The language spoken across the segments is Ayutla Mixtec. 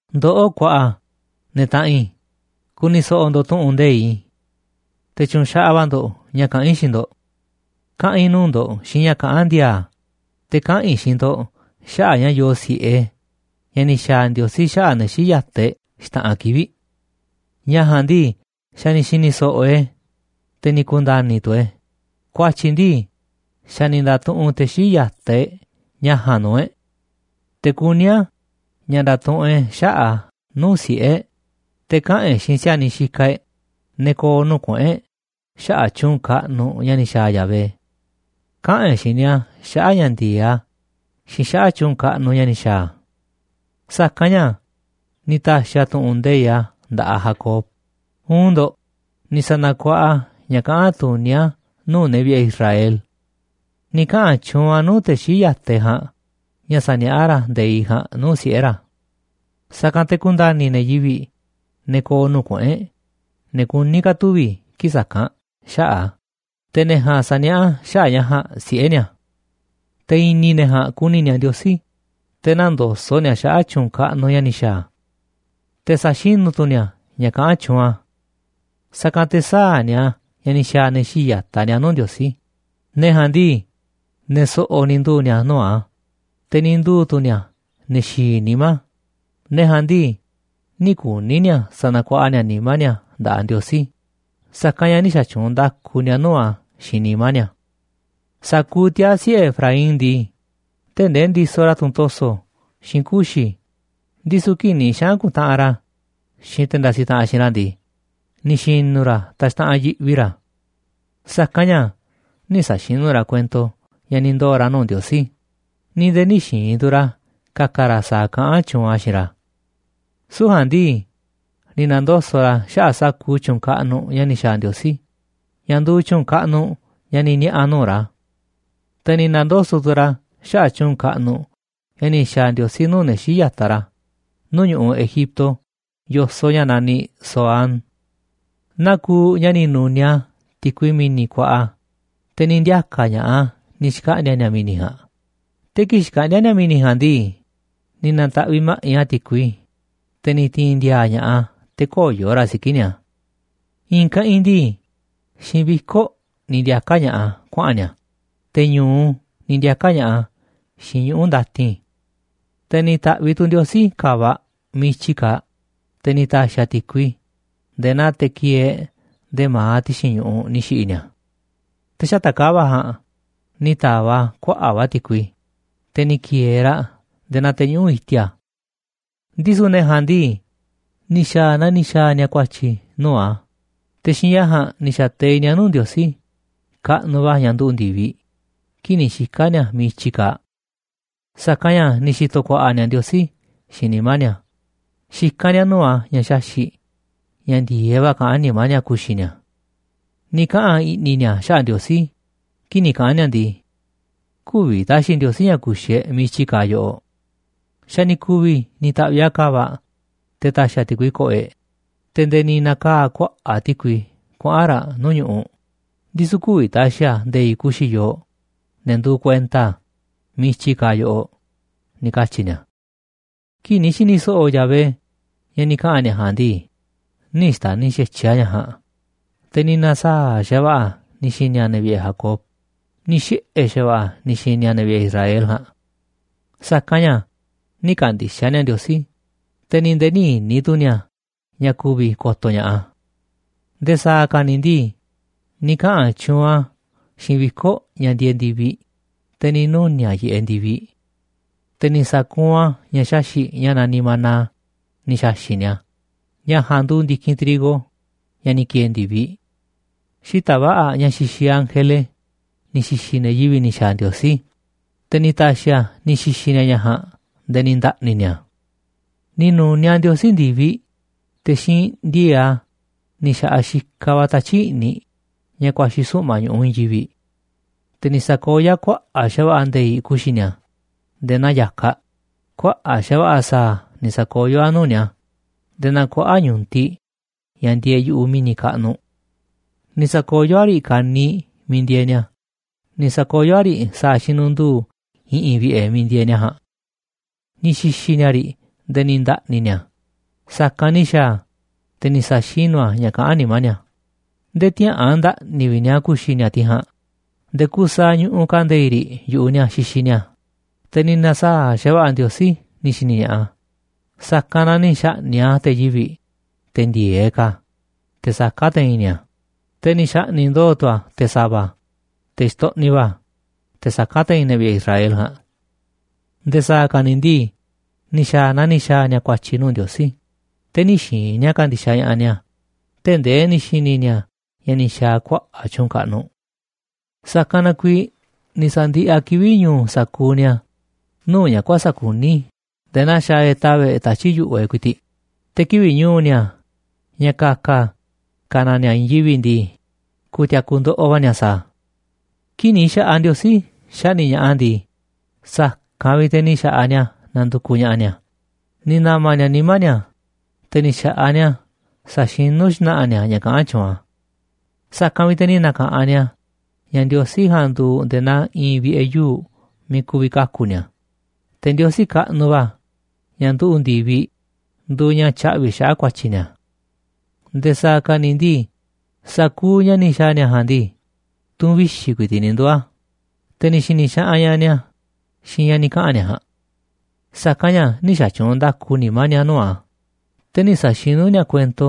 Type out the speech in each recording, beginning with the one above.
Ndoꞌó kuaꞌa, ne̱ taꞌanꞌ i̱, ku̱ni̱ so̱ꞌo̱ ndo̱ꞌ tu̱ꞌu̱n nde̱iꞌ i̱. Te̱ tyu̱nxaꞌaꞌ va̱ ndo̱ꞌ ña̱ kaꞌán i̱ xiinꞌ ndo̱ꞌ. Kaꞌa̱n i̱ nuu̱ꞌ ndo̱ꞌ xiinꞌ ña̱ kaꞌán ndi̱a̱a̱, te̱ kaꞌa̱n i̱ xiinꞌ ndo̱ꞌ xaꞌa̱ꞌ ña̱ yoo si̱ꞌe ña̱ ni̱ xa̱a̱ Ndiosí xaꞌa̱ꞌ ne̱ xii̱ꞌ ya̱taꞌ e̱ꞌ xta̱ꞌanꞌ kivi̱ꞌ. Ña̱ ja̱a̱nꞌ ndii, xa̱ ni̱ xi̱ni̱ so̱ꞌo̱ e̱ꞌ e̱, te̱ ni̱ ku̱nda̱ni̱ tu̱ e̱ꞌ e̱, ku̱a̱tyi̱ ndii, xa̱ ni̱ nda̱tuꞌunꞌ te̱ xii̱ꞌ ya̱taꞌ e̱ꞌ ña̱ ja̱a̱nꞌ nuu̱ꞌ e̱ꞌ. Te̱ kuní a̱ ña̱ nda̱tuꞌunꞌ e̱ꞌ xaꞌa̱ꞌ a̱ nuu̱ꞌ siꞌe̱ e̱ꞌ, te̱ kaꞌa̱n e̱ꞌ xiinꞌ si̱a̱niꞌ xikaꞌ e̱ꞌ, ne̱ ko̱o̱ nuu̱ꞌ kuꞌu̱n e̱ꞌ xaꞌa̱ꞌ tyu̱u̱n kaꞌnuꞌ ña̱ ni̱ xa̱a̱ Yahvé. Kaꞌa̱n e̱ꞌ xiinꞌ ni̱a̱ xaꞌa̱ꞌ ña̱ ndi̱e̱eꞌ a̱ xiinꞌ xaꞌa̱ꞌ tyu̱u̱n kaꞌnuꞌ ña̱ ni̱ xa̱a̱ a̱. Sa̱kanꞌ ña̱ ni̱ ta̱xi̱ a̱ tu̱ꞌu̱n nde̱iꞌ a̱ nda̱ꞌaꞌ Jacob, uun ndo̱ꞌ, ni̱ sa̱na̱kuaꞌa a̱ ña̱ kaꞌán tuní a̱ nuu̱ꞌ ne̱ vi̱ꞌe̱ Israel. Ni̱ kaꞌa̱n tyuunꞌ a̱ nuu̱ꞌ te̱ xii̱ꞌ ya̱taꞌ e̱ꞌ ja̱a̱nꞌ ña̱ sa̱niaꞌá ra̱ nde̱iꞌ ja̱a̱nꞌ nuu̱ꞌ siꞌe̱ ra̱. Sa̱kanꞌ te̱ ku̱nda̱ni̱ ne̱ yivi̱ꞌ, ne̱ ko̱o̱ nuu̱ꞌ kuꞌu̱n e̱ꞌ, ne̱ kuní ka̱ tuvi̱ kii̱ꞌ sa̱kanꞌ, xaꞌa̱ꞌ a̱, te̱ ne̱ ja̱a̱nꞌ sa̱niaꞌá xaꞌa̱ꞌ ña̱ ja̱a̱nꞌ siꞌe̱ ni̱a̱. Te̱ i̱ni̱ ne̱ ja̱a̱nꞌ ku̱ni̱ ni̱a̱ Ndiosí, te̱ nä̱ndoso̱ꞌ ni̱a̱ xaꞌa̱ꞌ tyu̱u̱n kaꞌnuꞌ ña̱ ni̱ xa̱a̱ a̱. Te̱ sa̱xinú tu̱ ni̱a̱ ña̱ kaꞌán tyuunꞌ a̱. Sa̱kanꞌ te̱ sä̱a̱ ni̱a̱ naa ni̱ xa̱a̱ ne̱ xii̱ꞌ ya̱taꞌ ni̱a̱ nuu̱ꞌ Ndiosí, ne̱ ja̱a̱nꞌ ndii, ne̱ so̱ꞌo̱ ni̱ nduu̱ ni̱a̱ nuu̱ꞌ a̱, te̱ ni̱ nduu̱ tu̱ ni̱a̱ ne̱ xi̱i̱ nimá, ne̱ ja̱a̱nꞌ ndii, nï̱ kuni̱ ni̱a̱ sa̱na̱kuaꞌa ni̱a̱ nimá ni̱a̱ nda̱ꞌaꞌ Ndiosí, sa̱kanꞌ ña̱ nï̱ xa̱tyuunꞌ nda̱ku ni̱a̱ nuu̱ꞌ a̱ xiinꞌ nimá ni̱a̱. Sa̱kuuꞌ tiaa̱ siꞌe̱ Efraín ndii, tee̱ꞌ ndee ndisoꞌ ra̱ tunꞌ to̱so̱ xiinꞌ kuxi̱, ndisu̱ kii̱ꞌ ni̱ xaꞌa̱n ku̱ntaꞌanꞌ ra̱ xiinꞌ te̱ ndasiꞌ taꞌanꞌ xiinꞌ ra̱ ndii, ni̱ xi̱nu̱ ra̱ taxtaꞌanꞌ yiꞌvi ra̱. Sa̱kanꞌ ña̱ nï̱ sa̱xinú ra̱ kuento ña̱ ni̱ ndoo̱ ra̱ nuu̱ꞌ Ndiosí, ni̱ nde̱e̱ nï̱ xi̱i̱n tu̱ ra̱ ka̱ka̱ ra̱ sa̱a̱ kaꞌán tyuunꞌ a̱ xiinꞌ ra̱. Süu̱ꞌ ja̱a̱nꞌ ndii, ni̱ na̱ndoso̱ꞌ ra̱ xaꞌa̱ꞌ sa̱kuuꞌ tyu̱u̱n kaꞌnuꞌ ña̱ ni̱ xa̱a̱ Ndiosí, ña̱ nduuꞌ tyu̱u̱n kaꞌnuꞌ ña̱ ni̱ niaꞌa̱ a̱ nuu̱ꞌ ra̱. Te̱ ni̱ na̱ndoso̱ꞌ tu̱ ra̱ xaꞌa̱ꞌ tyu̱u̱n kaꞌnuꞌ ña̱ ni̱ xa̱a̱ Ndiosí nuu̱ꞌ ne̱ xii̱ꞌ ya̱taꞌ ra̱ nuu̱ꞌ ñu̱ꞌuꞌ Egipto yo̱soꞌ ña̱ naniꞌ Zoán. Naa kuuꞌ ña̱ ni̱ nu̱niaꞌ a̱ ti̱kui mi̱ni̱ kuaꞌa, te̱ ni̱ ndiaka̱ ña̱ꞌaꞌ a̱ ni̱ xkaꞌndi̱a̱ ni̱a̱ mi̱ni̱ ja̱a̱nꞌ, te̱ kii̱ꞌ xkaꞌndíá ni̱a̱ mi̱ni̱ ja̱a̱nꞌ ndii, ni̱ na̱ta̱ꞌviꞌ ma̱ꞌiꞌ a̱ ti̱kui, te̱ ni̱ ti̱i̱n ndi̱a̱a̱ ña̱ꞌaꞌ a̱ te̱ köyo̱ raꞌ siki̱ꞌ ni̱a̱. I̱i̱n keꞌinꞌ ndii, xiinꞌ viko̱ꞌ ni̱ ndiaka̱ ña̱ꞌaꞌ a̱ kuaꞌa̱n ni̱a̱, te̱ ñu̱u ni̱ ndiaka̱ ña̱ꞌaꞌ a̱ xiinꞌ ñuꞌu̱ ndatin. Te̱ ni̱ ta̱ꞌviꞌ tu̱ Ndiosí ka̱va̱ꞌ miiꞌ i̱tyi kaaꞌ, te̱ ni̱ ta̱xi̱ a̱ ti̱kui, nde̱e̱ naa teꞌ kieeꞌ nde̱e̱ ma̱aꞌ ti̱xi̱n ñu̱ꞌuꞌ, ni̱ xi̱ꞌi̱ ni̱a̱. Te̱ xata̱ꞌ ka̱va̱ꞌ ja̱a̱nꞌ ni̱ ta̱va̱ꞌ a̱ kuaꞌa̱ꞌ va̱ ti̱kui, te̱ ni̱ ki̱e̱e̱ raꞌ nde̱e̱ naa te̱ñuꞌu̱ꞌ i̱ti̱a̱. Ndisu̱ ne̱ ja̱a̱nꞌ ndii, ni̱ xa̱a̱ naa ni̱ xa̱a̱ ni̱a̱ ku̱a̱tyi̱ nuu̱ꞌ a̱, te̱ xiinꞌ ña̱ ja̱a̱nꞌ ni̱ xa̱teiꞌ ni̱a̱ nuu̱ꞌ Ndiosí kaꞌnuꞌ va̱ ña̱ nduꞌu̱ꞌ ndi̱viꞌ kii̱ꞌ ni̱ xika̱ ni̱a̱ miiꞌ i̱tyi kaaꞌ. Sa̱kanꞌ ña̱ ni̱ xi̱to̱ ku̱a̱ꞌa̱ ni̱a̱ Ndiosí xiinꞌ nimá ni̱a̱, xikán ni̱a̱ nuu̱ꞌ a̱ ña̱ xaxi̱ꞌ ña̱ ndi̱e̱eꞌ va̱ kaꞌán nimá ni̱a̱ ku̱xi̱ ni̱a̱. Ni̱ kaꞌa̱n i̱ꞌni̱ ni̱a̱ xaꞌa̱ꞌ Ndiosí kii̱ꞌ ni̱ kaꞌa̱n ni̱a̱ ndii: “Kü̱vi̱ ta̱xi̱ Ndiosí ña̱ ku̱xi̱ e̱ꞌ miiꞌ i̱tyi kaaꞌ yoꞌoꞌ. Xa̱ ni̱ ku̱vi̱ ni̱ ta̱ꞌviꞌ a̱ ka̱va̱ꞌ te̱ ta̱xi̱ a̱ ti̱kui ko̱ꞌo̱ e̱ꞌ, te̱ nde̱e̱ ni̱ na̱kaa̱ kuaꞌa̱ꞌ ti̱kui kuaꞌa̱n ra̱ nuu̱ꞌ ñu̱ꞌuꞌ, ndisu̱ kü̱vi̱ ta̱xi̱ a̱ nde̱i̱ꞌ ku̱xi̱ yooꞌ, ne̱ nduuꞌ kuenta a̱, miiꞌ i̱tyi kaaꞌ yoꞌoꞌ”, ni̱ katyi̱ ni̱a̱. Kii̱ꞌ ni̱ xi̱ni̱ so̱ꞌo̱ Yahvé ña̱ ni̱ kaꞌa̱n ni̱a̱ ja̱a̱nꞌ ndii, nï̱ xta̱ni̱ xa̱tyiꞌ a̱ ña̱ ja̱a̱nꞌ, te̱ ni̱ na̱saa̱ꞌ xa̱va̱ꞌa̱ a̱ ni̱ xi̱ni̱ a̱ ne̱ vi̱ꞌe̱ Jacob, ni̱ xiꞌe̱ xa̱va̱ꞌa̱ a̱ ni̱ xi̱ni̱ ne̱ vi̱ꞌe̱ Israel ja̱a̱nꞌ. Sa̱kanꞌ ña̱ nï̱ kandixaꞌ ni̱a̱ Ndiosí, te̱ ni̱ nde̱e̱ nï̱ i̱ni̱ tu̱ ni̱a̱ ña̱ ku̱vi̱ ko̱to̱ ña̱ꞌaꞌ a̱. Nde̱e̱ sa̱a̱ ka̱ ni̱ ndii, ni̱ kaꞌa̱n tyuunꞌ a̱ xiinꞌ viko̱ꞌ ña̱ ndieeꞌ ndi̱viꞌ, te̱ ni̱ nuni̱a̱ꞌ yiꞌeꞌ ndi̱viꞌ. Te̱ ni̱ sa̱kuunꞌ a̱ ña̱ xaxi̱ꞌ ña̱ naniꞌ maná ni̱ xa̱xi̱ꞌ ni̱a̱, ña̱ ja̱a̱nꞌ nduuꞌ ndi̱kinꞌ trigo ña̱ ni̱ ki̱e̱e̱ ndi̱viꞌ. Xita̱ꞌ va̱ꞌa̱, ña̱ xixiꞌ ángele, ni̱ xi̱xi̱ ne̱ yivi̱ꞌ ni̱ xa̱a̱ Ndiosí, te̱ ni̱ ta̱xi̱ a̱ ni̱ xi̱xi̱ ni̱a̱ ña̱ ja̱a̱nꞌ nde̱e̱ ni̱ nda̱ꞌni̱ ni̱a̱. Ni̱ nu̱niaꞌ Ndiosí ndi̱viꞌ, te̱ xiinꞌ ndi̱e̱e̱ꞌ a̱ ni̱ xa̱ꞌaꞌ xikaꞌ va̱ tatyi̱ꞌ i̱ꞌniꞌ ña̱ ku̱a̱xi̱ suꞌma̱ꞌ ñu̱ꞌuꞌ i̱i̱n yivi̱ꞌ. Te̱ ni̱ sa̱koyó a̱ kuaꞌa̱ꞌ xa̱va̱ꞌa̱ nde̱i̱ꞌ ku̱xi̱ ni̱a̱ nde̱e̱ naa ya̱kaꞌ, kuaꞌa̱ꞌ xa̱va̱ꞌa̱ sa̱a̱ ni̱ sa̱koyó a̱ nuu̱ꞌ ni̱a̱ nde̱e̱ naa kuaꞌa̱ꞌ ñu̱tiꞌ ña̱ ndieeꞌ yu̱ꞌuꞌ mi̱ni̱ kaꞌnuꞌ. Ni̱ sa̱koyó a̱ riꞌ kaniiꞌ miiꞌ ndieeꞌ ni̱a̱, ni̱ sa̱koyó a̱ riꞌ sa̱a̱ xinundu̱u̱ i̱ꞌi̱n vi̱ꞌe̱ miiꞌ ndieeꞌ ni̱a̱ ja̱a̱nꞌ. Ni̱ xi̱xi̱ ni̱a̱ riꞌ nde̱e̱ ni̱ nda̱ꞌni̱ ni̱a̱, sa̱kanꞌ ni̱ xa̱a̱ a̱, te̱ ni̱ sa̱xinú a̱ ña̱ kaꞌán nimá ni̱a̱. Nde̱e̱ tïaꞌa̱an nda̱ꞌni̱ vi̱ꞌ ni̱a̱ ku̱xi̱ ni̱a̱ tiꞌ ja̱a̱nꞌ, nde̱e̱ kuuꞌ saaꞌ ñuꞌuꞌ ka̱ nde̱i̱ꞌ riꞌ yu̱ꞌuꞌ ni̱a̱ xixiꞌ ni̱a̱, te̱ ni̱ na̱saa̱ꞌ xa̱va̱ꞌa̱ Ndiosí ni̱ xi̱ni̱ ña̱ꞌaꞌ a̱, sa̱kanꞌ na ni̱ xa̱ꞌni̱ꞌ a̱ te̱ yivi̱ꞌ, te̱ ndi̱e̱eꞌ ka̱, te̱ saká te̱i̱n ni̱a̱, te̱ ni̱ xa̱ꞌni̱ꞌ ndo̱o̱ tu̱ a̱ te̱ sa̱va̱, te̱ xtoꞌniꞌ va̱, te̱ saká te̱i̱n ne̱ vi̱ꞌe̱ Israel ja̱a̱nꞌ. Nde̱e̱ sa̱a̱ ka̱ ni̱ ndii, ni̱ xa̱a̱ naa ni̱ xa̱a̱ ni̱a̱ ku̱a̱tyi̱ nuu̱ꞌ Ndiosí, te̱ nï̱ xi̱i̱n ni̱a̱ ka̱ndi̱xaꞌ ña̱ꞌaꞌ ni̱a̱ tee̱ꞌ ndee ni̱ xi̱ni̱ ni̱a̱ ña̱ ni̱ xa̱a̱ a̱ kuaꞌa̱ꞌ tyu̱u̱n kaꞌnuꞌ. Sa̱kanꞌ na kuiiꞌ ni̱ sa̱ndiꞌiꞌ a̱ kivi̱ꞌ ñu̱u̱ sa̱kuuꞌ ni̱a̱ nuu̱ꞌ ña̱ kuäsa̱ꞌ kuní nde̱e̱ naa xaaꞌ e̱ꞌ tava̱ꞌ e̱ꞌ tatyi̱ꞌ yu̱ꞌuꞌ e̱ꞌ ku̱i̱ti̱ꞌ, te̱ kivi̱ꞌ ñu̱u̱ ni̱a̱ ña̱ ka̱ka̱ ka̱ na ni̱a̱ i̱i̱n yivi̱ꞌ ndii, ku̱ti̱a̱ku̱ ndoꞌoꞌ va̱ ni̱a̱ sa̱a̱ a̱. Kii̱ꞌ ni̱ xa̱ꞌaꞌ Ndiosí xaꞌni̱ꞌ ña̱ꞌaꞌ a̱ ndii, sa̱kanꞌ vi̱ꞌ te̱ ni̱ xa̱ꞌaꞌ ni̱a̱ nandukuꞌ ña̱ꞌaꞌ ni̱a̱, ni̱ na̱ma̱ ni̱a̱ nimá ni̱a̱, te̱ ni̱ xa̱ꞌaꞌ ni̱a̱ saxinú xna̱ꞌa̱ ni̱a̱ ña̱ kaꞌán tyuunꞌ a̱. Sa̱kanꞌ vi̱ꞌ te̱ ni̱ na̱ka̱ꞌanꞌ ni̱a̱ ña̱ Ndiosí ja̱a̱nꞌ nduuꞌ nde̱e̱ naa i̱i̱n vi̱ꞌe̱ yuu̱ꞌ miiꞌ ku̱vi̱ kaku̱ ni̱a̱. Te̱ Ndiosí kaꞌnuꞌ va̱ ña̱ nduꞌu̱ꞌ ndi̱viꞌ nduuꞌ ña̱ tyaꞌvi̱ xaꞌa̱ꞌ ku̱a̱tyi̱ ni̱a̱. Nde̱e̱ sa̱a̱ ka̱ ni̱ ndii, sa̱kuuꞌ ña̱ ni̱ xa̱a̱ ni̱a̱ ja̱a̱nꞌ ndii, tu̱n vixi̱ ku̱i̱ti̱ꞌ ni̱ nduu̱ a̱, te̱ ni̱ xi̱ni̱ xaꞌanꞌ ña̱ꞌaꞌ ni̱a̱ xiinꞌ ña̱ ni̱ kaꞌa̱n ni̱a̱ ja̱a̱nꞌ. Sa̱kanꞌ ña̱ nï̱ xa̱tyuunꞌ nda̱ku nimá ni̱a̱ nuu̱ꞌ a̱, te̱ nï̱ sa̱xinú ni̱a̱ kuento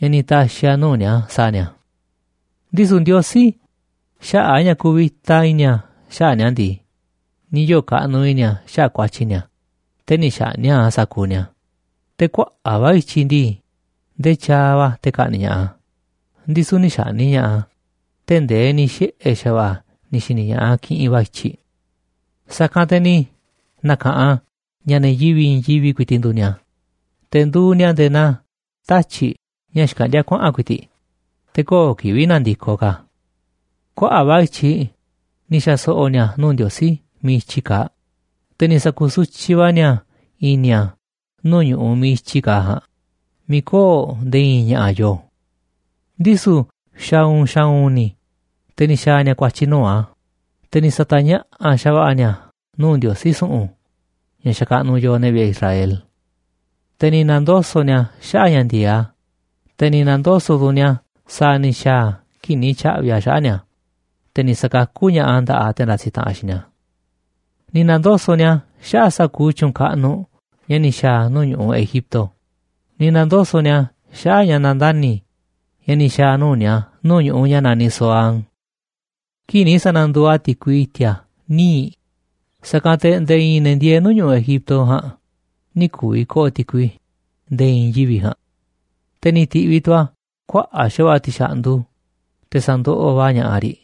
ña̱ ni̱ ta̱xi̱ a̱ nuu̱ꞌ ni̱a̱ sa̱a̱ ni̱a̱. Ndisu̱ Ndiosí, xaꞌa̱ꞌ ña̱ kuvita i̱ni̱ a̱ xaꞌa̱ꞌ ni̱a̱ ndii, ni̱ yoo̱ kaꞌnuꞌ i̱ni̱ a̱ xaꞌa̱ꞌ ku̱a̱tyi̱ ni̱a̱, te̱ nï̱ xaꞌni̱ꞌ a̱ sa̱kuuꞌ ni̱a̱ te̱ kuaꞌa̱ꞌ va̱ i̱tyiꞌ ndii, ndee tyaaꞌ va̱ te̱ ka̱ꞌni̱ꞌ ña̱ꞌaꞌ a̱, ndisu̱ nï̱ xa̱ꞌni̱ꞌ ña̱ꞌaꞌ a̱ tee̱ꞌ ndee ni̱ xiꞌe̱ xa̱va̱ꞌa̱ a̱ ni̱ xi̱ni̱ ña̱ꞌaꞌ a̱ kiꞌinꞌ va̱ i̱tyiꞌ. Sa̱kanꞌ te̱ ni̱ na̱ka̱ꞌanꞌ a̱ ña̱ ne̱ yivi̱ꞌ i̱i̱n yivi̱ꞌ ku̱i̱ti̱ꞌ nduuꞌ ni̱a̱, te̱ nduuꞌ ni̱a̱ nde̱e̱ naa tatyi̱ꞌ ña̱ xkaꞌndíá kuaꞌa̱n ku̱i̱ti̱ꞌ, te̱ köo̱ꞌ kivi̱ꞌ nandikoꞌ ka̱ a̱. Kuaꞌa̱ꞌ va̱ i̱tyiꞌ ni̱ xa̱so̱ꞌo̱ ni̱a̱ nuu̱ꞌ Ndiosí miiꞌ i̱tyi kaaꞌ, te̱ ni̱ sa̱ku̱sutyiꞌ va̱ ni̱a̱ i̱ni̱ a̱ nuu̱ꞌ ñu̱ꞌuꞌ miiꞌ i̱tyi kaaꞌ ja̱a̱nꞌ miiꞌ köo̱ꞌ nde̱e̱ i̱i̱n ña̱ꞌa̱ yooꞌ. Ndisu̱ xa̱u̱u̱n xa̱u̱u̱n ni̱, te̱ ni̱ xa̱a̱ ni̱a̱ ku̱a̱tyi̱ nuu̱ꞌ a̱, te̱ ni̱ sa̱ta̱ñaꞌa̱ꞌ xa̱va̱ꞌa̱ ni̱a̱ nuu̱ꞌ Ndiosí su̱ꞌu̱n ña̱ xakaꞌnuꞌ yooꞌ, ne̱ vi̱ꞌe̱ Israel. Te̱ ni̱ na̱ndoso̱ꞌ ni̱a̱ xaꞌa̱ꞌ ña̱ ndi̱e̱eꞌ a̱, te̱ ni̱ na̱ndoso̱ꞌ tu̱ ni̱a̱ sa̱a̱ ni̱ xa̱a̱ a̱ kii̱ꞌ ni̱ tya̱ꞌvi̱ a̱ xaꞌa̱ꞌ ni̱a̱, te̱ ni̱ sa̱kakú ña̱ꞌaꞌ a̱ nda̱ꞌaꞌ te̱ ndasiꞌ taꞌanꞌ xiinꞌ ni̱a̱. Ni̱ na̱ndoso̱ꞌ ni̱a̱ xaꞌa̱ꞌ sa̱kuuꞌ tyu̱u̱n kaꞌnuꞌ ña̱ ni̱ xa̱a̱ a̱ nuu̱ꞌ ñu̱ꞌuꞌ Egipto, ni̱ na̱ndoso̱ꞌ ni̱a̱ xaꞌa̱ꞌ ña̱ nandani̱ ña̱ ni̱ xa̱a̱ a̱ nuu̱ꞌ ni̱a̱ nuu̱ꞌ ñu̱ꞌuꞌ ña̱ naniꞌ Zoán. Kii̱ꞌ ni̱ sa̱na̱nduuꞌ a̱ ti̱kui i̱ti̱a̱ níiꞌ, sa̱kanꞌ te̱ nde̱e̱ i̱i̱n ne̱ ndieeꞌ nuu̱ꞌ ñu̱ꞌuꞌ Egipto ja̱a̱nꞌ nï̱ ku̱vi̱ ko̱ꞌo̱ ti̱kui nde̱e̱ i̱i̱n yivi̱ ja̱a̱nꞌ. Te̱ ni̱ ti̱ꞌviꞌ tu̱ a̱ kuaꞌa̱ꞌ xa̱va̱ꞌa̱ ti̱xa̱ꞌndu, te̱ sa̱ndoꞌoꞌ va̱ ña̱ꞌaꞌ riꞌ,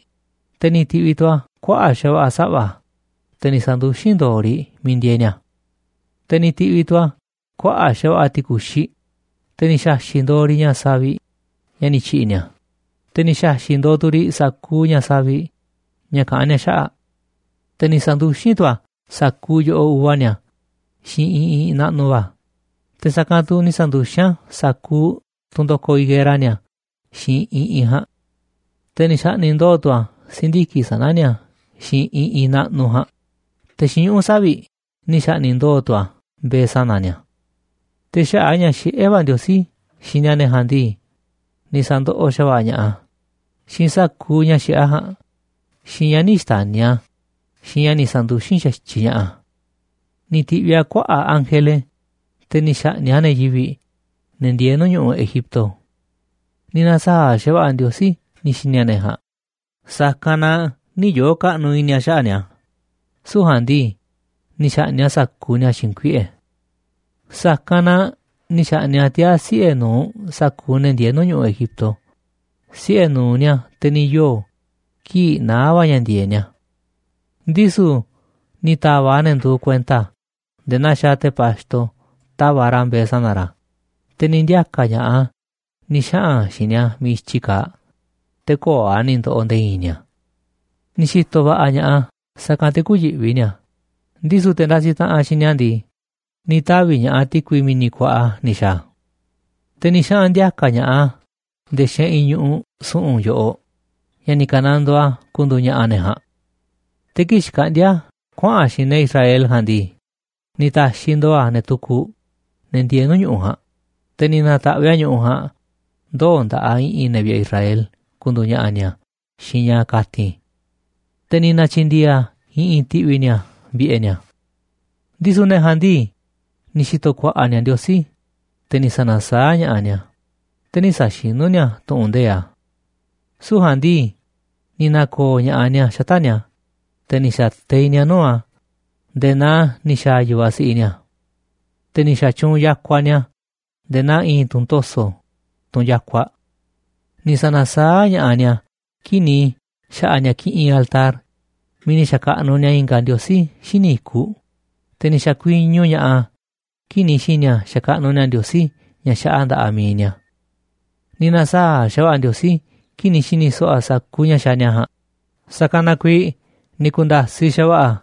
te̱ ni̱ ti̱ꞌviꞌ tu̱ a̱ kuaꞌa̱ꞌ xa̱va̱ꞌa̱ saꞌva̱, te̱ ni̱ sa̱nduxín ndo̱o̱ riꞌ miiꞌ ndieeꞌ ni̱a̱. Te̱ ni̱ ti̱ꞌviꞌ tu̱ a̱ kuaꞌa̱ꞌ xa̱va̱ꞌa̱ ti̱ku̱xiꞌ, te̱ ni̱ xa̱xi̱ꞌ ndo̱o̱ riꞌ ña̱ saviꞌ ña̱ ni̱ tyi̱ꞌi̱ ni̱a̱, te̱ ni̱ xa̱xi̱ꞌ ndo̱o̱ tu̱ riꞌ sa̱kuuꞌ ña̱ savi̱ꞌ ña̱ kaꞌán ni̱a̱ xaꞌa̱ꞌ. Te̱ ni̱ sa̱nduxín tu̱ a̱ sa̱kuuꞌ yo̱ꞌoꞌ uva ni̱a̱ xiinꞌ iꞌinꞌ naꞌnuꞌ va̱, te̱ sa̱kanꞌ tu̱ ni̱ sa̱nduxín a̱ sa̱kuuꞌ tunꞌ ndo̱koꞌ higuera ni̱a̱ xiinꞌ iꞌinꞌ ja̱a̱nꞌ. Te̱ ni̱ xa̱ꞌni̱ꞌ ndo̱o̱ tu̱ a̱ si̱ndiki̱ꞌ sana̱ ni̱a̱ xiinꞌ iꞌinꞌ naꞌnuꞌ ja̱a̱nꞌ, te̱ xiinꞌ ñuꞌu̱ savi̱ꞌ ni̱ xa̱ꞌni̱ꞌ ndo̱o̱ tu̱ a̱ mbe̱e̱ sana̱ ni̱a̱. Te̱ xaꞌa̱ꞌ a̱ ña̱ xiꞌé va̱ Ndiosí xini a̱ ne̱ ja̱a̱nꞌ ndii, ni̱ sa̱ndoꞌoꞌ xa̱va̱ꞌa̱ ña̱ꞌaꞌ a̱ xiinꞌ sa̱kuuꞌ ña̱ xiꞌé a̱ ja̱a̱nꞌ, xiinꞌ ña̱ nï̱ xta̱ni̱ a̱, xiinꞌ ña̱ ni̱ sa̱nduxín xa̱tyiꞌ ña̱ꞌaꞌ a̱. Ni̱ ti̱ꞌviꞌ a̱ kuaꞌa̱ꞌ ángele, te̱ ni̱ xa̱ꞌni̱ꞌ a̱ ne̱ yivi̱ꞌ, ne̱ ndieeꞌ nuu̱ꞌ ñu̱ꞌuꞌ Egipto. Ni̱ na̱saa̱ꞌ xa̱va̱ꞌa̱ Ndiosí ni̱ xi̱ni̱ a̱ ne̱ ja̱a̱nꞌ, sa̱kanꞌ na nï̱ yoo̱ kaꞌnuꞌ i̱ni̱ a̱ xaꞌa̱ꞌ ni̱a̱, süu̱ꞌ ja̱a̱nꞌ ndii, ni̱ xa̱ꞌni̱ꞌ a̱ sa̱kuuꞌ ni̱a̱ xiinꞌ kuiꞌe̱. Sa̱kanꞌ na ni̱ xa̱ꞌni̱ꞌ a̱ tiaa̱ siꞌe̱ nu̱uꞌ sa̱kuuꞌ ne̱ ndieeꞌ nuu̱ꞌ ñu̱ꞌuꞌ Egipto, siꞌe̱ nu̱uꞌ ni̱a̱, te̱ ni̱ yoo̱ kii̱ꞌ naá va̱ ña̱ ndi̱e̱eꞌ ni̱a̱. Ndisu̱ ni̱ ta̱va̱ꞌ a̱ ne̱ nduuꞌ kuenta a̱ nde̱e̱ naa xaaꞌ te̱ pa̱xto tava̱ꞌ ra̱ mbe̱e̱ sana̱ ra̱, te̱ ni̱ ndiaka̱ ña̱ꞌaꞌ a̱ ni̱ xaꞌa̱n a̱ xiinꞌ ni̱a̱ miiꞌ i̱tyi kaaꞌ, te̱ köo̱ꞌ a̱ ni̱ ndo̱ꞌo̱ nde̱e̱ i̱i̱n ni̱a̱. Ni̱ xi̱to̱ va̱ꞌa̱ ña̱ꞌaꞌ a̱, sa̱kanꞌ te̱ kü̱yi̱ꞌvi ni̱a̱, ndisu̱ te̱ ndasiꞌ taꞌanꞌ xiinꞌ ni̱a̱ ndii, ni̱ tavi̱ ña̱ꞌaꞌ ti̱kui mi̱ni̱ kuaꞌa ni̱ xa̱a̱ a̱. Te̱ ni̱ xaꞌa̱n ndi̱a̱ka̱ ña̱ꞌaꞌ a̱ nde̱e̱ xeꞌinꞌ ñu̱ꞌuꞌ su̱ꞌu̱n yoꞌoꞌ, ña̱ ni̱ ka̱nandoo a̱ ku̱ndu̱u̱ ña̱ꞌa̱ ne̱ ja̱a̱nꞌ. Te̱ kii̱ꞌ xkaꞌndíá a̱ kuaꞌa̱n a̱ xiinꞌ ne̱ Israel ja̱a̱nꞌ ndii, ni̱ ta̱xiꞌ ndo̱o̱ a̱ ne̱ tukuꞌ, ne̱ ndieeꞌ nuu̱ꞌ ñu̱ꞌuꞌ ja̱a̱nꞌ, te̱ ni̱ na̱ta̱ꞌviꞌ a̱ ñu̱ꞌuꞌ ja̱a̱nꞌ ndoo̱ nda̱ꞌaꞌ i̱ꞌi̱n ne̱ vi̱ꞌe̱ Israel ku̱ndu̱u̱ ña̱ꞌa̱ ni̱a̱ xiinꞌ ña̱ kati̱n. Te̱ ni̱ na̱tyi̱ndi̱e̱e̱ a̱ i̱ꞌi̱n ti̱ꞌvi̱ ni̱a̱ vi̱ꞌe̱ ni̱a̱. Ndisu̱ ne̱ ja̱a̱nꞌ ndii, ni̱ xi̱to̱ ku̱a̱ꞌa̱ ni̱a̱ Ndiosí, te̱ ni̱ sa̱na̱saáꞌ ña̱ꞌaꞌ ni̱a̱, te̱ nï̱ sa̱xinú ni̱a̱ tu̱ꞌu̱n nde̱iꞌ a̱. Süu̱ꞌ ja̱a̱nꞌ ndii, ni̱ na̱ko̱o̱ ña̱ꞌaꞌ ni̱a̱ xata̱ꞌ ni̱a̱, te̱ ni̱ xa̱teiꞌ ni̱a̱ nuu̱ꞌ a̱ nde̱e̱ naa ni̱ xa̱a̱ yu̱vaꞌ siꞌiꞌ ni̱a̱. Te̱ ni̱ xa̱tyuunꞌ yakuaꞌ ni̱a̱ nde̱e̱ naa i̱i̱n tunꞌ to̱so̱, tunꞌ yakuaꞌ. Ni̱ sa̱na̱saáꞌ ña̱ꞌaꞌ ni̱a̱ kii̱ꞌ ni̱ xa̱ꞌa̱ ni̱a̱ kiꞌinꞌ altar miiꞌ ni̱ xa̱kaꞌnuꞌ ni̱a̱ i̱nga̱ ndiosí xíniꞌ i̱kuꞌ, te̱ ni̱ xa̱kuiñu ña̱ꞌaꞌ a̱ kii̱ꞌ ni̱ xi̱ni̱ a̱ xakaꞌnuꞌ ni̱a̱ ndiosí ña̱ xaꞌa nda̱ꞌaꞌ mi̱iꞌ ni̱a̱. Ni̱ na̱saa̱ꞌ xa̱va̱ꞌa̱ Ndiosí kii̱ꞌ ni̱ xi̱ni̱ so̱ꞌo̱ a̱ sa̱kuuꞌ ña̱ xaaꞌ ni̱a̱ ja̱a̱nꞌ, sa̱kanꞌ na kuiiꞌ ni̱ ku̱nda̱siꞌ xa̱va̱ꞌa̱ a̱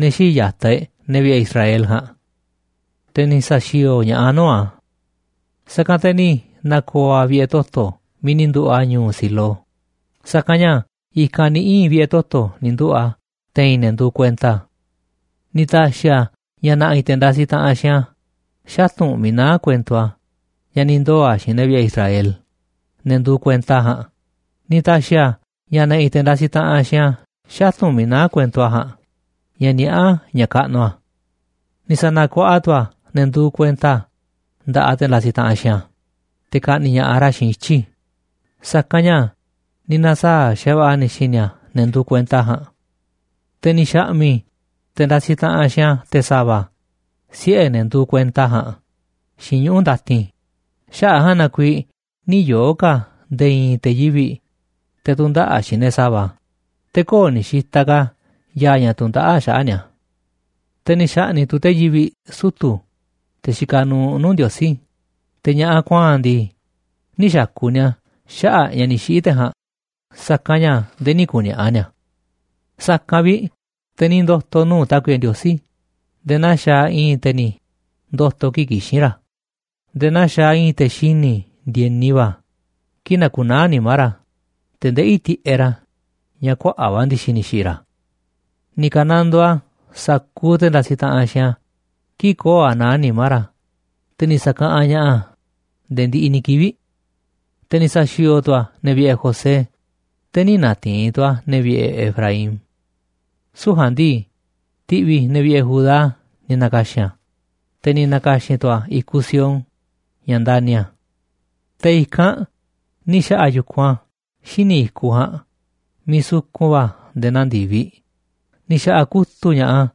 ne̱ xii̱ꞌ ya̱taꞌ e̱ꞌ, ne̱ vi̱ꞌe̱ Israel ja̱a̱nꞌ, te̱ ni̱ sa̱xi̱o̱o̱ ña̱ꞌaꞌ a̱ nuu̱ꞌ a̱. Sa̱kanꞌ te̱ ni̱ na̱ko̱o̱ a̱ vi̱ꞌe̱ toto̱ miiꞌ ni̱ nduꞌu̱ꞌ a̱ ñu̱u̱ Silo, sa̱kanꞌ ña̱ i̱kanꞌ ni̱ ii̱n vi̱ꞌe̱ toto̱ ni̱ nduꞌu̱ꞌ a̱ te̱i̱n ne̱ nduuꞌ kuenta a̱. Ni̱ ta̱xi̱ a̱ ña̱ na̱ꞌi̱ te̱ ndasiꞌ taꞌanꞌ xiinꞌ a̱ xatu̱nꞌ miiꞌ naá kuento a̱ ña̱ ni̱ ndoo̱ a̱ xiinꞌ ne̱ vi̱ꞌe̱ Israel, ne̱ nduuꞌ kuenta a̱ ja̱a̱nꞌ, ni̱ ta̱xi̱ a̱ ña̱ na̱ꞌi̱ te̱ ndasiꞌ taꞌanꞌ xiinꞌ a̱ xatu̱nꞌ miiꞌ naá kuento a̱ ja̱a̱nꞌ ña̱ niaꞌá ña̱ kaꞌnuꞌ a̱. Ni̱ sa̱na̱kuaꞌa tu̱ a̱ ne̱ nduuꞌ kuenta a̱ nda̱ꞌaꞌ te̱ ndasiꞌ taꞌanꞌ xiinꞌ a̱ te̱ ka̱ꞌni̱ꞌ ña̱ꞌaꞌ ra̱ xiinꞌ ityi̱, sa̱kanꞌ ña̱ ni̱ na̱saa̱ꞌ xa̱va̱ꞌa̱ a̱ ni̱ xi̱ni̱ a̱ ne̱ nduuꞌ kuenta a̱ ja̱a̱nꞌ. Te̱ ni̱ xa̱ꞌmi̱ꞌ te̱ ndasiꞌ taꞌanꞌ xiinꞌ a̱ te̱ sa̱va̱, siꞌe̱ ne̱ nduuꞌ kuenta a̱ ja̱a̱nꞌ, xiinꞌ ñuꞌu̱ ndatin, xaꞌa̱ꞌ a̱ ja̱a̱nꞌ na kuiiꞌ nï̱ yoo̱ ka̱ nde̱e̱ i̱i̱n te̱ yivi̱ꞌ, te̱ tu̱ndaꞌa̱ꞌ xiinꞌ ne̱ sa̱va̱, te̱ köo̱ꞌ ni̱ xitaꞌ ka̱ ya̱a̱ ña̱ tundaꞌáꞌ xaꞌa̱ꞌ ni̱a̱. Te̱ ni̱ xa̱ꞌni̱ꞌ tu̱ te̱ yivi̱ꞌ sutu̱, te̱ xikaꞌ nuuꞌ nuu̱ꞌ Ndiosí, te̱ ña̱ꞌaꞌ kuaa̱nꞌ ndii, nï̱ xa̱ku̱ ni̱a̱ xaꞌa̱ꞌ ña̱ ni̱ xiꞌi̱ te̱ ja̱a̱nꞌ, sa̱kanꞌ ña̱ nde̱e̱ nï̱ ku̱ni̱a̱ꞌa̱ ni̱a̱. Sa̱kanꞌ vi̱ꞌ te̱ ni̱ ndo̱to̱ nuu̱ꞌ Tákuiꞌe Ndiosí nde̱e̱ naa xaaꞌ i̱i̱n te̱ ni̱ ndo̱to̱ kii̱ꞌ kixín ra̱, nde̱e̱ naa xaaꞌ i̱i̱n te̱ xini̱ ndi̱e̱ni va̱ kii̱ꞌ nakunaá nimá ra̱, te̱ ndeꞌí tiꞌeꞌ ra̱ ña̱ kuaꞌa̱ꞌ va̱ ndi̱xi̱ ni̱ xi̱ꞌi̱ ra̱. Ni̱ ka̱nandoo a̱ sa̱kuuꞌ te̱ ndasiꞌ taꞌanꞌ xiinꞌ a̱ kii̱ꞌ köo̱ꞌ a̱ naá nimá ra̱, te̱ ni̱ sa̱kaꞌanꞌ ña̱ꞌaꞌ a̱ nde̱e̱ ndiꞌiꞌ ni̱ kivi̱ꞌ. Te̱ ni̱ sa̱xi̱o̱o̱ tu̱ a̱ ne̱ vi̱ꞌe̱ José, te̱ nï̱ na̱ti̱i̱n tu̱ a̱ ne̱ vi̱ꞌe̱ Efraín. Süu̱ꞌ ja̱a̱nꞌ ndii, ti̱ꞌvi̱ ne̱ vi̱ꞌe̱ Judá ni̱ na̱ka̱xi̱n a̱, te̱ ni̱ na̱ka̱xi̱n tu̱ a̱ i̱kuꞌ Sión, ña̱ ndani̱ a̱. Te̱ i̱kanꞌ ni̱ xa̱ꞌa̱ a̱ yu̱kunꞌ a̱ xíniꞌ i̱kuꞌ ja̱a̱nꞌ miiꞌ sukun va̱ nde̱e̱ naa ndi̱viꞌ, ni̱ xa̱ꞌa̱ kutu̱ꞌ ña̱ꞌaꞌ a̱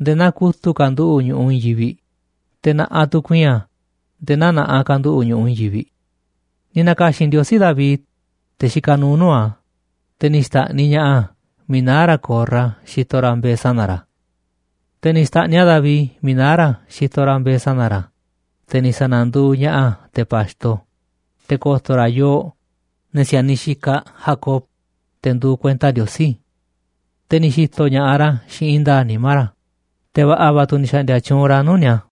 nde̱e̱ naa kutu̱ꞌ kanduꞌu̱ꞌ ñu̱ꞌuꞌ i̱i̱n yivi̱ꞌ, te̱ na̱ꞌaꞌ tu̱ ku̱i̱i̱n a̱ nde̱e̱ naa na̱ꞌaꞌ kanduꞌu̱ꞌ ñu̱ꞌuꞌ i̱i̱n yivi̱ꞌ. Ni̱ na̱ka̱xi̱n Ndiosí David, te̱ xikaꞌ nuuꞌ nuu̱ꞌ a̱, te̱ ni̱ xta̱ꞌniꞌ ña̱ꞌaꞌ miiꞌ naá ra̱ ko̱rra xitoꞌ ra̱ mbe̱e̱ sana̱ ra̱. Te̱ ni̱ xta̱ꞌniꞌ a̱ David miiꞌ naá ra̱ xitoꞌ ra̱ mbe̱e̱ sana̱ ra̱, te̱ ni̱ sa̱na̱nduuꞌ ña̱ꞌaꞌ a̱ te̱ pa̱xto, te̱ ko̱to̱ ra̱ yooꞌ, ne̱ si̱a̱niꞌ xikaꞌ Jacob, te̱ nduuꞌ kuenta Ndiosí. Te̱ ni̱ xi̱to̱ ña̱ꞌaꞌ ra̱ xiinꞌ i̱i̱n nda̱a̱ꞌ nimá ra̱, te̱ va̱ꞌa̱ va̱ tu̱ ni̱ xa̱ꞌndi̱a̱ tyuunꞌ ra̱ nuu̱ꞌ ni̱a̱.